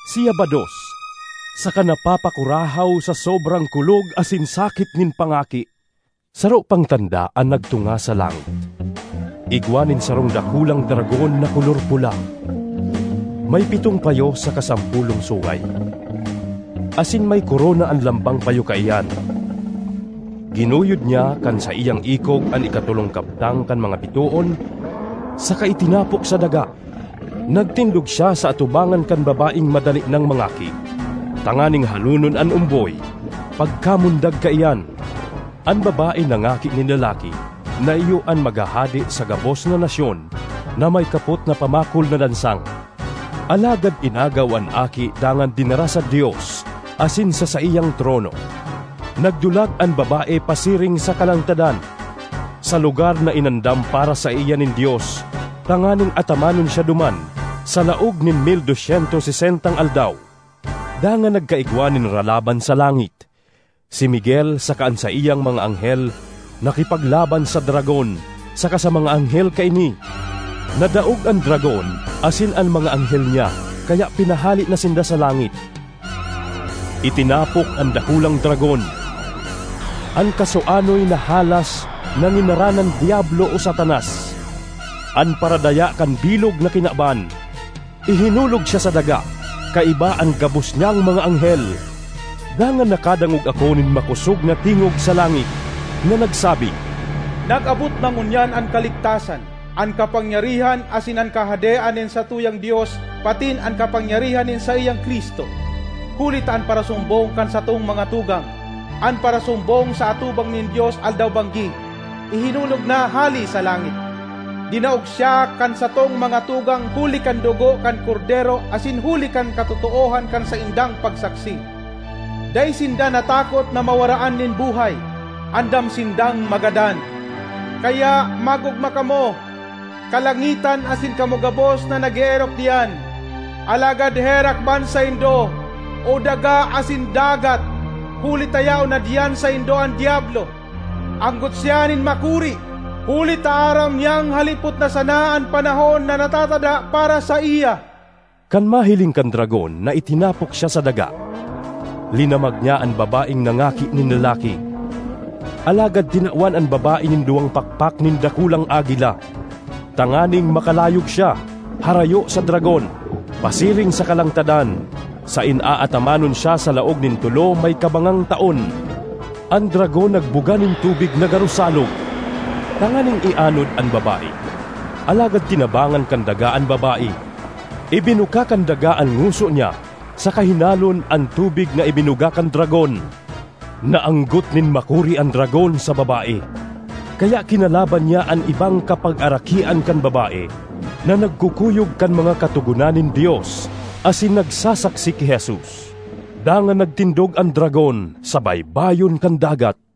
Siya bados saka napapakurahaw sa sobrang kulog asin sakit nin pangaki. Saro pang tanda an nagtunga sa langit; igwa nin sarong dakulang dragon na kolor pula, may pitong payo saka sampolong sungay, asin may korona an lambang payo kaiyan. Ginuyod niya kan saiyang ikog an ikatolong kabtang kan mga bitoon saka itinapok sa daga. Nagtindog siya sa atubangan kan babaeng madali nang mangaki, tanganing halonon an omboy pagkamundag kaiyan. An babae nangaki nin lalaki na iyo an maghahade sa gabos na nasyon na may kapot na pamakol na lansang. Alagad inagaw an aki dangan dinara sa Dios asin sa saiyang trono. Nagdulag an babae pasiring sa kalangtadan, sa lugar na inandam para saiya nin Dios tanganing atamanon siya duman sa laog nin mil dos syentos sesentang aldaw. Dangan nagkaigwa nin ralaban sa langit. Si Miguel saka an saiyang mga anghel nakipaglaban sa dragon saka sa mga anghel kaini. Nadaog an dragon asin an mga anghel niya kaya pinahale na sinda sa langit. Itinapok an dakulang dragon—an kasuanoy na halas na nginaranan Diablo o Satanas—an paradaya kan bilog na kinaban. Ihinulog siya sa daga, kaiba an gabos niyang mga anghel. Dangan nakadangog ako nin makosog na tingog sa langit na nagsabi, “Nag-abot na ngunyan an kaligtasan, an kapangyarihan asin an kahadean nin satuyang Dios patin an kapangyarihan nin saiyang Cristo! Huli ta an parasumbong kan satong mga tugang, an parasumbong sa atubang nin Dios aldaw-banggi, ihinulog na hale sa langit. Dinaog siya kan satong mga tugang huli kan dugo kan Kordero asin huli kan katotoohan kan saindang pagsaksi; dai sinda natakot na mawaraan nin buhay—andam sindang magadan. Kaya mag-ogma kamo, kalangitan asin kamo gabos na nag-eerok diyan! Alagad herak man saindo, o daga asin dagat! Huli ta yaon na diyan saindo an Diablo; anggot siya nin makuri, huli ta aram niyang halipot na sana an panahon na natatada para saiya.” Kan mahiling kan dragon na itinapok siya sa daga, linamag niya an babaeng nangaki nin lalaki. Alagad tinawan an babae nin duwang pakpak nin dakulang agila, tanganing makalayog siya, harayo sa dragon, pasiring sa kalangtadan, saen aatamanon siya sa laog nin tolo may kabangang taon. An dragon nagbuga nin tubig na garo salog, tanganing ianod an babae. Alagad tinabangan kan daga an babae; ibinuka kan daga an ngoso niya saka hinalon an tubig na ibinuga kan dragon. Naanggot nin makuri an dragon sa babae, kaya kinalaban niya an ibang kapagarakian kan babae na nagkukuyog kan mga katogonan nin Dios asin nagsasaksi ki Jesus. Dangan nagtindog an dragon sa baybayon kan dagat.